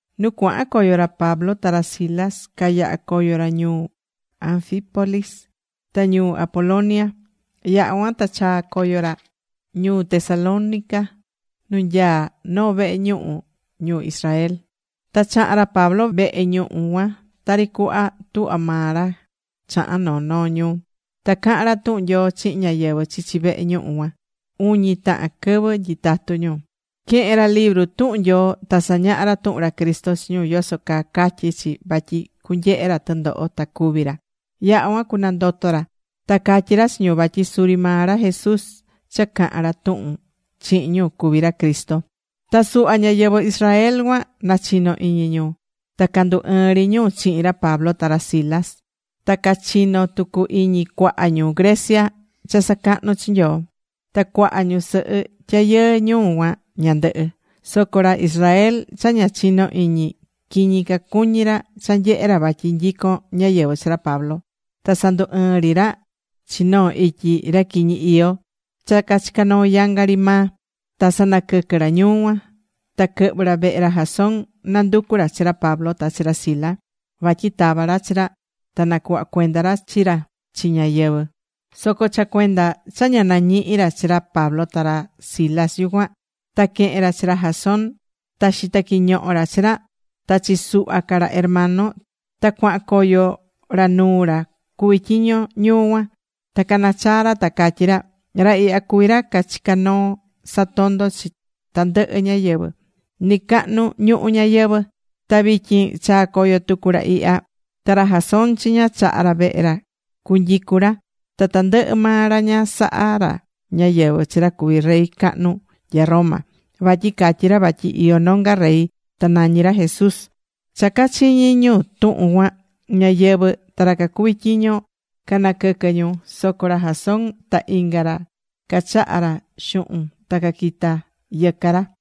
Nu cuahan coyo ra Pablo ta ra Silas, cayaha̱ coyo ra ñuu Anfípolis, ta ñuu Apolonia. Yaha̱ cuan ta chaa̱ coyo ra ñuu Tesalónica nu nyaá noo vehe ñuhu ñu Israel. Ta chaha̱n ra Pablo vehe ñuhu cuan tari cuhva tuhva maa ra chahán noo noo ñuu. Ta caha̱n ra tuhun Nyoo chihin ñáyɨvɨ chichi vehe ñuhu cuan uñi tahan quɨvɨ nyitatú ñu. Quehe̱n ra libru tuhun Nyoo ta sañaha̱ ra tuhun ra Cristo chi ñu yoso caa catyí chi vatyi cunyehe ra tɨndoho ta cucúvi ra. Yaha̱ cuan cunandoto ra. Ta catyí ra chi ñu vatyi suri maa ra Jesús cha cahán ra tuhun chihin ñu cuví ra Cristo. Ta suhva ñáyɨvɨ Israel cuan nachino̱ iñi ñu. Ta candu ɨɨn ri ñu chihin ra Pablo ta ra Silas. Ta cachino̱ tucu iñi cuaha ñu Grecia cha sacahnú chi Nyoo. Ta cuaha ñusɨhɨ tyayɨɨ ñuu cuan ñandɨhɨ. Soco ra Israel cha ña chinó iñi, quiñi cacuñí ra cha nyehé ra vatyi nyicón ñáyɨvɨ chi ra Pablo. Ta sandu ɨɨ̱n ri ra chi noo ityi ra quiñi iyó cha cachicá noo yanga ri maa. Ta sanaquɨquɨ̱ ra ñuu cuan. Ta quɨhvɨ̱ ra vehe ra Jasón, nanducú ra chi ra Pablo ta chi ra Silas, vatyi tava ra chi ra, ta nacuhva cuenda ra chi ra chi ñáyɨvɨ. Soco cha cuenda cha ña nañihi̱ ra chi ra Pablo ta ra Silas yucuan, ta quehe̱n ra chi ra Jasón. Ta xita̱ quiñoho ra chi ra ta chi suhva ca ra hermano ta cuahan coyo ra nuu ra cuví tyiño ñuu cuan. Ta cana̱ chaa ra ta catyí ra: ―Ra ihya cuví ra cachicá noo satondó chi tandɨhɨ ñáyɨvɨ nɨcahnu ñuhu ñayɨvɨ̱. Ta vityin chaa̱ coyo tucu ra ihya. Ta ra Jasón chiña chaha̱ ra vehe ra cunyicu ra. Ta tandɨhɨ maa ra ña sahá ra ñáyɨvɨ chi ra cuví rey cahnu nya Roma. Vatyi catyí ra vatyi iyó nonga rey ta nañí ra Jesús. Cha cachiñi̱ ñu tuhun cuan, ñáyɨvɨ ta ra cacuví tyiño canaquɨquɨ ñu. Soco ra Jasón ta inga ra cachaha̱ ra xuhun ta caquita yɨca ra.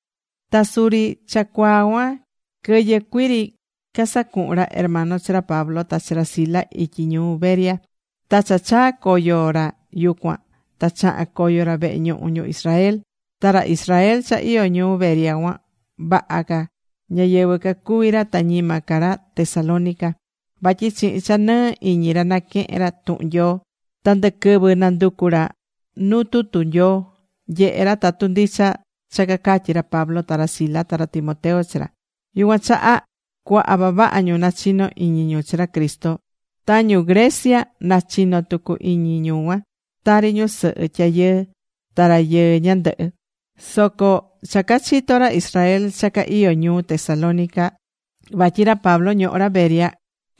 Ta suri cha cuaa cuan quɨyɨ cuii ri casacuhu̱n ra hermano chi ra Pablo ta ra Silas ityi ñuu Berea. Ta cha chaa̱ coyo ra yucuan ta chaha̱n coyo ra vehe ñuhu ñu Israel. Ta ra Israel cha iyó ñuu Berea cuan vaha ca ñáyɨvɨ cacuví ra ta ñima ca ra Tesalónica. Vatyi chihin cha nɨɨ iñi ra naquehe̱n ra tuhun Nyoo. Ta ndɨquɨvɨ nanducú ra nuu tutu Nyoo, nyehé ra tatu ndicha cha cacatyí ra Pablo ta ra Silas ta ra Timoteo chi ra. Yucuan chaha cuaha vavaha ñu nachino iñi ñu chi ra Cristo. Ta ñu Grecia nachino tucu iñi ñu cuan, tari ñusɨhɨ tyayɨɨ ta rayɨɨ ñandɨhɨ. Soco cha cachito̱ ra Israel cha ca iyó ñuu Tesalónica vatyi ra Pablo ñohó ra Berea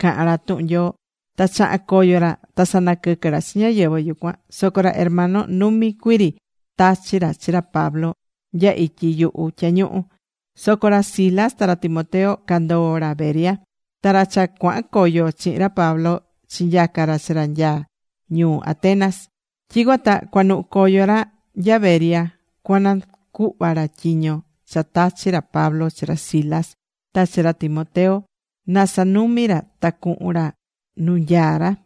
cahán ra tuhun Nyoo, ta chaha̱n coyo ra ta sanaquɨquɨ̱ ra chi ñáyɨvɨ yucuan. Soco ra hermano numi cuii ri tachi̱ ra chi ra Pablo nya ityi yuhu tyañuhu. Soco ra Silas ta ra Timoteo candoo̱ ra Berea. Ta ra cha cuahan coyo chihin ra Pablo chinyaca̱ ra chi ra nya ñuu Atenas. Tyicuan ta cuanuhu̱ coyo ra nya Berea cuanacuhva ra tyiño cha tachi̱ ra Pablo chi ra Silas ta chi ra Timoteo, na sanumi ra ta cuhun ra nu nyaá ra.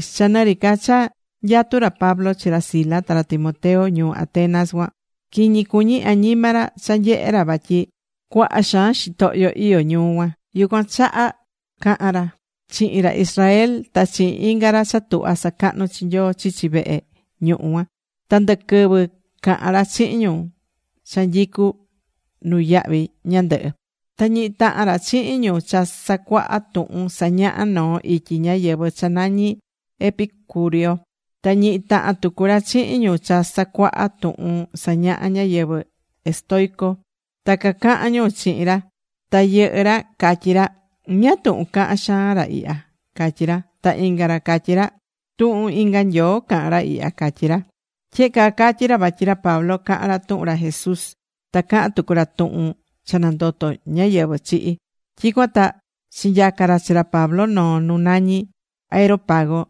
Cha nɨri ca cha nyatú ra Pablo chi ra Silas ta ra Timoteo ñuu Atenas cuan quiñi cuñí añima ra cha nyehé ra vatyi cuaha xaan xitohyo iyó ñuu cuan. Yucuan chaha caha̱n ra chihin ra Israel, ta chihin inga ra cha tuhvá sacahnú chi Nyoo chichi vehe ñuhu cuan. Ta ndɨ quɨvɨ cahán ra chihin ñu cha nyicu nuyahvi ñandɨhɨ. Ta ñihi̱ tahan ra chihin ñu cha sacuaha tuhun sañahá noo ityi ñáyɨvɨ cha nañí ñu epicúreo. Ta ñihi tahan tucu ra chihin ñu cha sacuaha tuhun sañahá ñáyɨvɨ estoico. Ta cacahan ñu chihin ra. Ta yɨhɨ́ ra catyí ra: ―¿Ñáá tuhun cahan xaan ra ihya? ―catyí ra. Ta inga ra catyí ra: ―Tuhun inga nyoo cahán ra ihya ―catyí ra. Tyehe caa catyi̱ ra vatyi ra Pablo cahán ra tuhun ra Jesús, ta cahán tucu ra tuhun cha nandoto̱ ñáyɨvɨ chihi̱. Tyicuan ta chinyaca̱ ra chi ra Pablo noo nu nañí Areópago,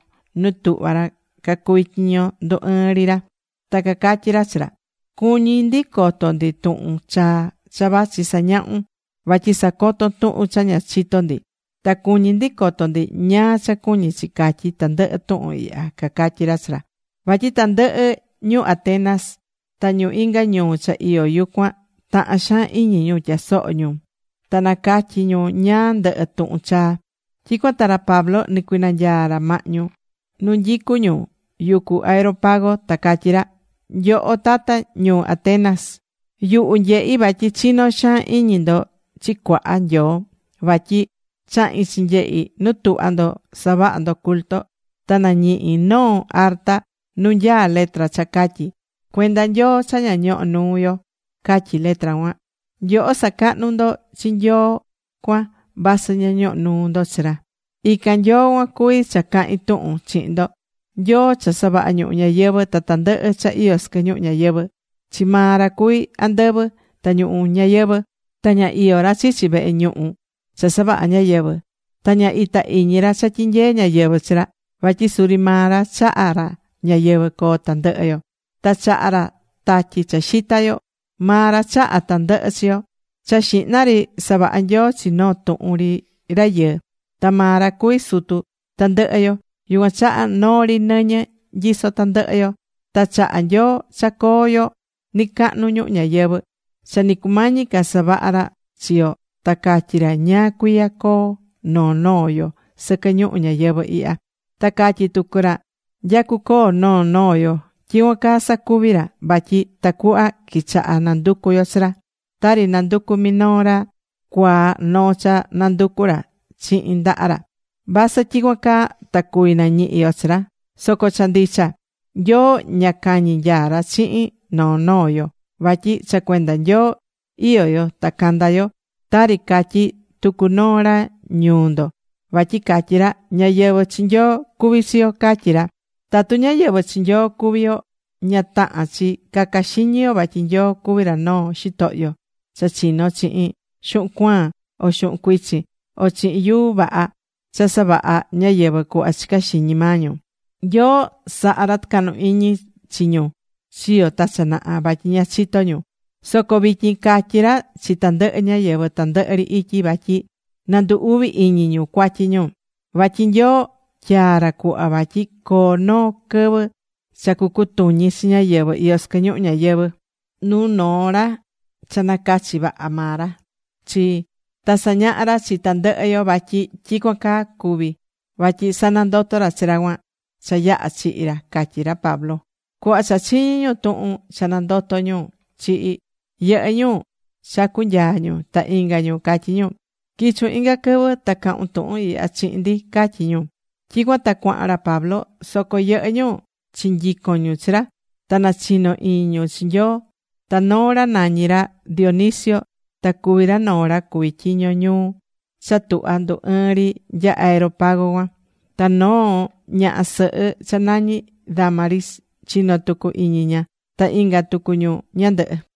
nu tuhva ra cacuvi tyiño ndu ɨɨn ri ra. Ta cacatyí ra chi ra: ―Cuñí ndi coto ndi tuhun chaa cha vachi sañahún. Vatyi sacotón tuhun cha ña chitó ndi. Ta cuñí ndi coto ndi ñáá cha cuñí chi catyí tandɨhɨ tuhun ihya ―cacatyí ra chi ra. Vatyi tandɨhɨ ñu Atenas ta ñu inga ñuu cha iyó yucuan tahán xaan iñi ñu tyasoho ñu ta nacatyi ñu ñáá ndɨhɨ tuhun chaa. Tyicuan ta ra Pablo nicuinanyaa̱ ra mahñu nu nyicu ñu yucu Areópago, ta catyí ra: ―Nyoho Tata ñuu Atenas, yuhu nyehí vatyi chinó xaan iñi ndo chi cuaha nyoo. Vatyi chahi̱n chinyehi nu tuhvá ndo savaha ndo culto. Ta nañihi̱ noo arta nu nyaá letra cha catyí: “Cuenda Nyoo cha ña ñohó nuu yo”, catyí letra cuan. Nyoho sacahnú ndo chi Nyoo cuan vasɨ ña ñohó nuu ndo chi ra. Ican Nyoo cuan cuví cha cahín tuhun chihin ndo. Nyoo cha savaha̱ ñuhu ñayɨvɨ̱ ta tandɨhɨ cha iyó sɨquɨ ñuhu ñayɨvɨ̱. Chi maa ra cuví andɨvɨ ta ñuhu ñayɨvɨ̱. Ta ña iyó ra chichi vehe ñuhu cha savahá ñáyɨvɨ. Ta ña itá iñi ra cha tyinyeé ñáyɨvɨ chi ra. Vatyi suri maa ra chaha̱ ra ñayɨvɨ̱ coo tandɨhɨ yo. Ta chahá ra tatyi cha xitá yo. Maa ra chaha̱ tandɨhɨ chi yo. Cha xihna ri savaha̱ Nyoo chi noo tuhun ri rayɨɨ. Ta maa ra cuví sutu tandɨhɨ yo. Yucuan chaha noo ri nɨñɨ nyisó tandɨhɨ yo. Ta chaha̱ Nyoo cha coo yo nɨcahnu ñuhu ñayɨvɨ̱. Cha nɨ cumañi ca savaha̱ ra chi yo ta catyí ra ñáá cuiya coo noo noo yo sɨquɨ ñuhu ñayɨvɨ̱ ihya. Ta catyí tucu ra nya cucoo noo noo yo. Tyicuan caa sacuvi̱ ra vatyi tacuhva quichaha nanducu yo chi ra. Tari nanducú minoo ra cuaa noo cha nanducú ra chihin ndaha ra, vasɨ tyicuan caa ta cuvi nañihi yo chi ra. Soco cha ndicha, Nyoo ña cañi nyaá ra chihin noo noo yo. Vatyi cha cuenda Nyoo iyó yo ta candá yo. Tari catyí tucu noo ra ñuu ndo, vatyi catyí ra: “Ñáyɨvɨ chi Nyoo cuví chi yo”, catyí ra. Tatu ñáyɨvɨ chi Nyoo cuví yo, ña tahán chi caca xiñi yo vatyi Nyoo cuví ra noo xitohyo cha chino̱ chihin xuhun cuaan, o xuhun cuichin, o chihin yuu vaha cha savahá ñáyɨvɨ cuhva chicá xiñi maa ñu. Nyoo sahá ra tɨcahnu iñi chi ñu chiyo̱ ta cha naha, vatyi ña chitó ñu. Soco vityin catyí ra chi tandɨhɨ ñáyɨvɨ tandɨhɨ ri ityi vatyi na ndu uvi iñi ñu cuatyi ñu. Vatyi Nyoo tyaa̱ ra cuhva vatyi coo noo quɨvɨ cha cucutuñi chi ñáyɨvɨ iyó sɨquɨ ñuhu ñáyɨvɨ nuu noo ra cha nacachi̱ vaha maa ra chi. Ta sañaha̱ ra chi tandɨhɨ yo vatyi tyicuan caa cuvi̱ vatyi sanandoto̱ ra chi ra cuan cha yaha̱ chihi̱ ra ―catyí ra Pablo. Cuhva cha chiñí ñu tuhun cha nandotó ñu chihi̱, yɨhɨ́ ñu chacu nyaá ñu, ta inga ñu catyí: ―Qui̱chun inga quɨvɨ ta ca̱hun tuhun ihya chihin ndi ―catyí ñu. Tyicuan ta cuahan ra Pablo. Soco yɨhɨ́ ñu chinyico̱n ñu chi ra, ta nachino iñi ñu chi Nyoo. Ta noo ra nañí ra Dionisio, ta cuví ra noo ra cuví tyiño ñuu cha tuhvá ndu ɨɨn nya Areópago cuan. Ta noo ñaha sɨhɨ cha nañí Dámaris chino tucu iñi ña, ta inga tucu ñu ñándɨhɨ.